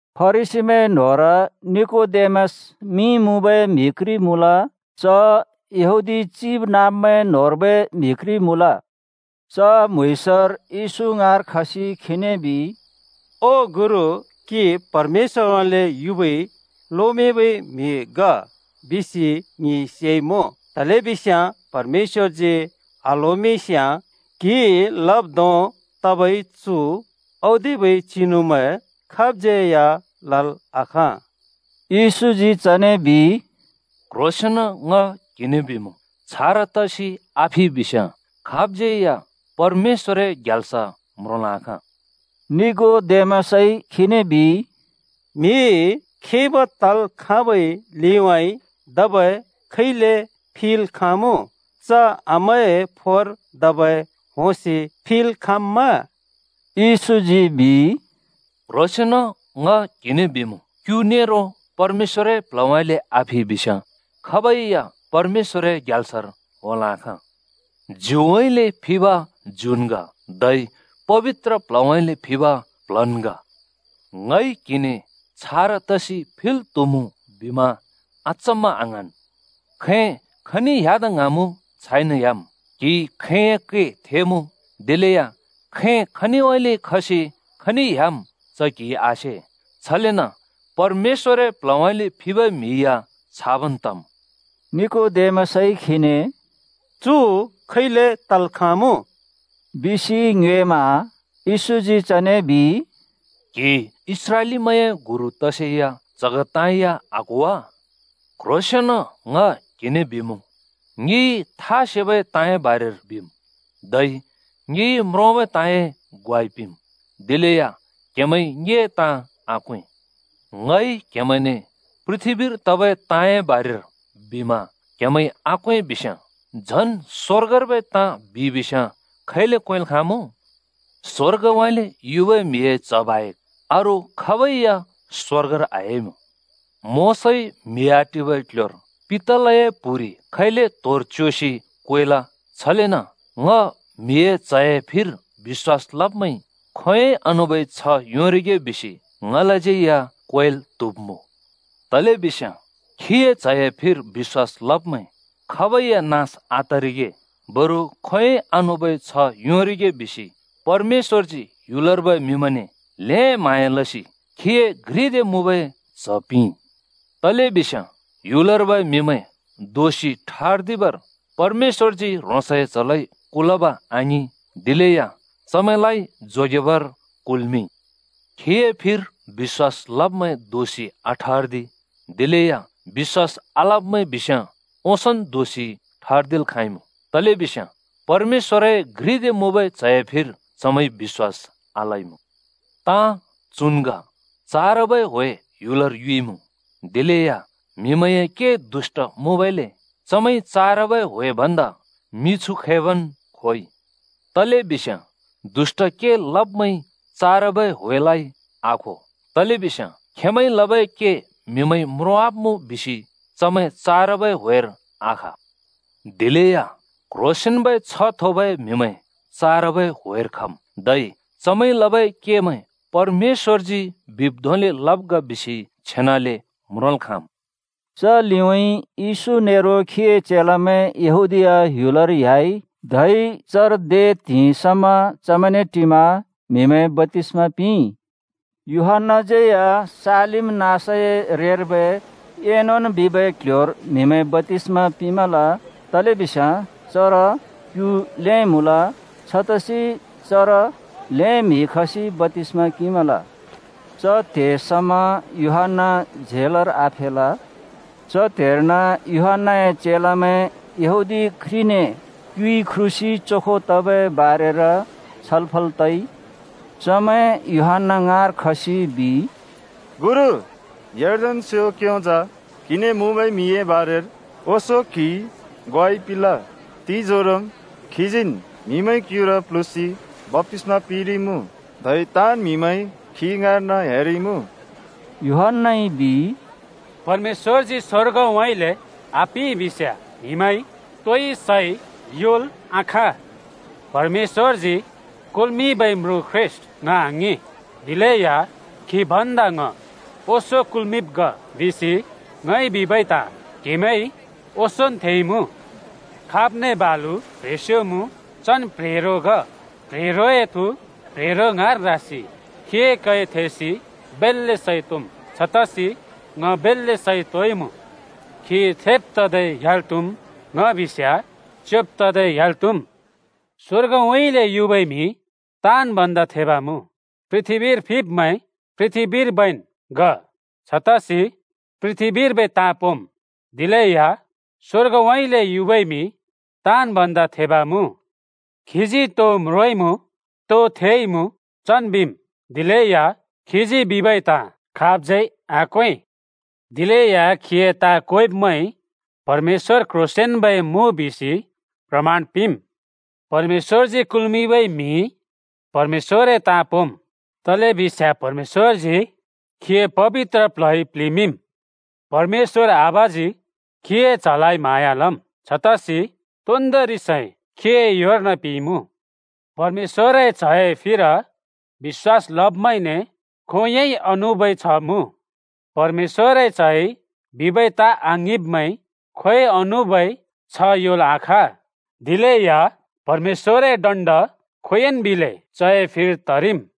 फरिसीमैं न्होंर निकोदेमस मिं मुँबै म्हि घ्रि मुँल। च यहूदी चिबनाँब्मैं न्होंर्बै म्हि घ्रि मुँल। च म्‍हुँइँसर येशू ङाँर खसि खीने बिइ, “ओ गुरु, क्‍हि परमेश्‍वरउँइँले युबै लोमिंबै म्हि ग बिसि ङिइ सेइमुँ, तलेबिस्याँ परमेश्‍वरजी आल्होमिंस्याँ क्‍हिइ लब् धों तबै चु औदिबै चिनुमैं खाबज्यै लल् आखाँ।” येशूजी चने बिइ, “क्‍ह्रोंसेंन ङ क्‍हिने बिमुँ, छारा तसि आफिइ बिस्याँ खाबै या परमेश्‍वरए ग्याल्स म्रोंल् आखाँ।” निकोदेमसइ खीने बिइ, “म्हि खिब् तल् खाँबै लिउँइँ धबै खैले फिल् खाँमुँ? च आमाए फोर धबै होंसि फिल् खाँम्मा?” येशूजी बिइ, “क्‍ह्रोंसेंन ङ क्‍हिने बिमुँ, क्‍यु नेरो परमेश्‍वरए प्ल्हउँइँले आफिइ बिस्याँ खाबै या परमेश्‍वरए ग्याल्सर होंल् आखाँ। ज्युउँइँले फिब ज्युन् ग, धै पबित्र प्ल्हउँइँले फिब प्ल्हन् ग। ङइ क्हिने ‘छारा तसि फिल् त्हुमुँ’ बिमा अचम्मा आङ्हाँन्। खैं खनि ह्‍यादा ङ्हाँमुँ छाइन ह्‍याम्। क्हिइ खैंए कै थेमुँ, दिलेया खैं खनिउँइँले खसि खनि ह्‍याम् च क्हिइ आसे। छलेन परमेश्‍वरए प्ल्हउँइँले फिबै म्हि या छाबन् तम्।” निकोदेमसइ खीने “चु खैले तल् खाँमुँ?” बिसि ङ्योएमा येशूजी चने बिइ, “क्‍हि इस्राएलीमैंए गुरु तसेया च्हग ताँ या आक्हो वा? क्ह्रोंसेंन ङ क्हिने बिमुँ, ङिइ था सेबै ताँए बारेर बिम्, धै ङिइ म्रोंबै ताँए ग्वाइ पिंम्, दिलेया क्हेमैंइ ङिए ताँ आक्वें। ङइ क्हेमैंने पृथ्‍बीर तबै ताँए बारेर बिमा क्‍हेमैंइ आक्‍वें बिस्याँ, झन् स्‍वर्गर्बै ताँ बिइ बिस्याँ खैले क्‍वेंल् खाँमुँ? स्वर्गउँइँले युबै म्हिए च्ह बाहेक अरू खाबै या स्वर्गर आह्‍याइमुँ। “मोशाइ म्हि आटिबै क्ल्ह्‍योर पितलए प्हुरि खैले त्होर च्योसि क्वेल, छलेन ङ म्हिए च्‍हए फिर बिश्‍वास लब्मैंइ खोंयोंइ आनुबै छ्‍ह योंरिगे बिसि ङलाज्यै या क्वेल् त्हुब्मुँ। तलेबिस्याँ खीए च्हए फिर बिश्‍वास लब्मैं खाबै या नास आतरिगे, बरु खोंयोंइ आनुबै छ्ह योंरिगे बिसि परमेश्‍वरजी ह्‍युलर्बै म्हिमैंने ल्‍हें म्हाँया लसि खीए घ्रि दे मुँबै च्‍ह पिंइ। तलेबिस्याँ ह्‍युलर्बै म्हिमैं दोषि ठर्दिबर परमेश्‍वरजी ह्रोंसए च्हलाइ कुलब आङिं, दिलेया चमैंलाइ जोगेबर कुल्मिंइ। “खीए फिर बिश्‍वास लब्मैं दोषि आठर्दि, दिलेया बिश्‍वास आलब्मैं बिस्याँ ओंसोंन् दोषि ठर्दिल् खाँइमुँ, तलेबिस्याँ परमेश्‍वरए घ्रिदे मुँबै च्हए फिर चमैंइ बिश्‍वास आलइँमुँ। ताँ चुन् ग: चारबै ह्‍वे ह्‍युलर युइमुँ, दिलेया म्हिमैंए के दुष्‍ट मुँबइले चमैंइ चारबै ह्‍वे भन्दा मिछु खैबन् खोइ। तलेबिस्याँ दुष्‍ट के लब्मैंइ चारबै ह्‍वेलाइ आखो, तलेबिस्याँ खेंमैंइ लबै के म्‍हिमैंइ म्रोंवाब्मुँ बिसि चमैं चारबै ह्‍वेर आखा। दिलेया क्ह्रोंसेंन्बै छ्ह थोबै म्हिमैं चारबै ह्‍वेर खम्। धै चमैंइ लबै केमैं परमेश्‍वरजी बिब् धोंले लब् ग बिसि छेनले म्रोंल् खाँम्।” च लिउँइँ येशू नेरो खीए चेलामैं यहूदीया ह्‍युलर ह्‍याइ, धै चर दे त्हिंइ समा चमैंने टिमा म्हिमैं बप्‍तिस्‍मा पिंइ। यूहन्‍नाज्यै या सालीम नाँसए रेर्बै एनोन बिबै क्ल्ह्‍योर म्हिमैं बप्‍तिस्‍मा पिंमल, तलेबिस्याँ चर क्यु ल्हें मुँल। छतसि चर ल्हें म्हि खसि बप्‍तिस्मा किंमल। च त्‍हे समा यूहन्‍ना झेलर आफेल। च त्हेर्न यूहन्‍नाए चेलामैं यहूदी घ्रिने क्‍युइ ख्रुसि चोखो तबै बारेर छलफल तइ। चमैं यूहन्‍ना ङाँर खसि बिइ, “गुरु! यर्दन स्‍यों क्‍योंजा क्‍हिने मुँबै म्हिए बारेर ओंसों क्हिइ ग्वाइ पिंल, तिंजोरोम् खीजीन् म्हिमैं क्युर प्ल्हुँसि बप्‍तिस्‍मा पिंरिइमुँ। धै ताँन् म्हिमैं खी ङाँर्न ह्‍यारिइमुँ।” यूहन्‍नाइ बिइ, “परमेश्‍वरजी स्वर्गउँइँले आपिंइ बिस्‍याँ म्हिमैंइ तोइ सै योंल् आखाँ। ‘परमेश्‍वरजी कुल्‍मिंबै म्रुँ ख्रीष्‍ट ङ आङिं, दिलेया खी भन्दा ङ ओंसों कुल्‍मिंब् ग।’ बिसि ङइ बिबै ताँ क्हेमैंइ ओंसोंन् थेइमुँ खाब्ने बालु प्ह्रेंस्यो मुँ, चन् प्ह्रेंरो ग। प्ह्रेंरोए थु प्ह्रेंरो ङाँर रासि खीए कै थेसि बेल्‍ले सैं तोंम्। छतसि ङ बेल्‍ले सैं तोंइँमुँ। खी थेब् तदै ह्‍याल् त्‍हुम्, ङ बिस्याँ च्‍योंब तदै ह्‍याल् त्‍हुम्। “स्‍वर्गउँइँले युबै म्हि ताँन् भन्दा थेब मुँ। पृथ्‍बीर फिब्मैं पृथ्‍बीर्बैन् ग, छतसि पृथ्‍बीर्बै ताँ पोंम्। दिलेया स्‍वर्गउँइँले युबै म्हि ताँन् भन्दा थेब मुँ। खीजी तो म्रोंइँमुँ, तो थेइमुँ, चन् बिम्, दिलेया खीजी बिबै ताँ खाबज्यै आक्‍वें। दिलेया खीए ताँ क्वेंब्मैंइ परमेश्‍वर क्ह्रोंसेंन्बै मुँ बिसि प्रमाण पिंम्। परमेश्‍वरजी कुल्मिंबै म्हिइ परमेश्‍वरए ताँ पोंम्, तलेबिस्याँ परमेश्‍वरजी खीए पबित्र प्ल्हइ प्लिमिंम्। परमेश्‍वर आबाजी खीए च्‍हलाइ म्‍हाँया लम्, छतसि तोन्दोंरि सै खीए योर्न पिंइमुँ। परमेश्‍वरए च्‍हए फिर बिश्‍वास लब्मैंने खोंयोंइ आनुबै छ्‍ह मुँ। परमेश्‍वरए च्हइ बिबै ताँ आङिंब्मैंइ खोंयोंइ आनुबै छ्‍ह योंल् आखाँ, दिलेया परमेश्‍वरए दण्ड खोंयोंइ बिलै चए फिर तरिम्।”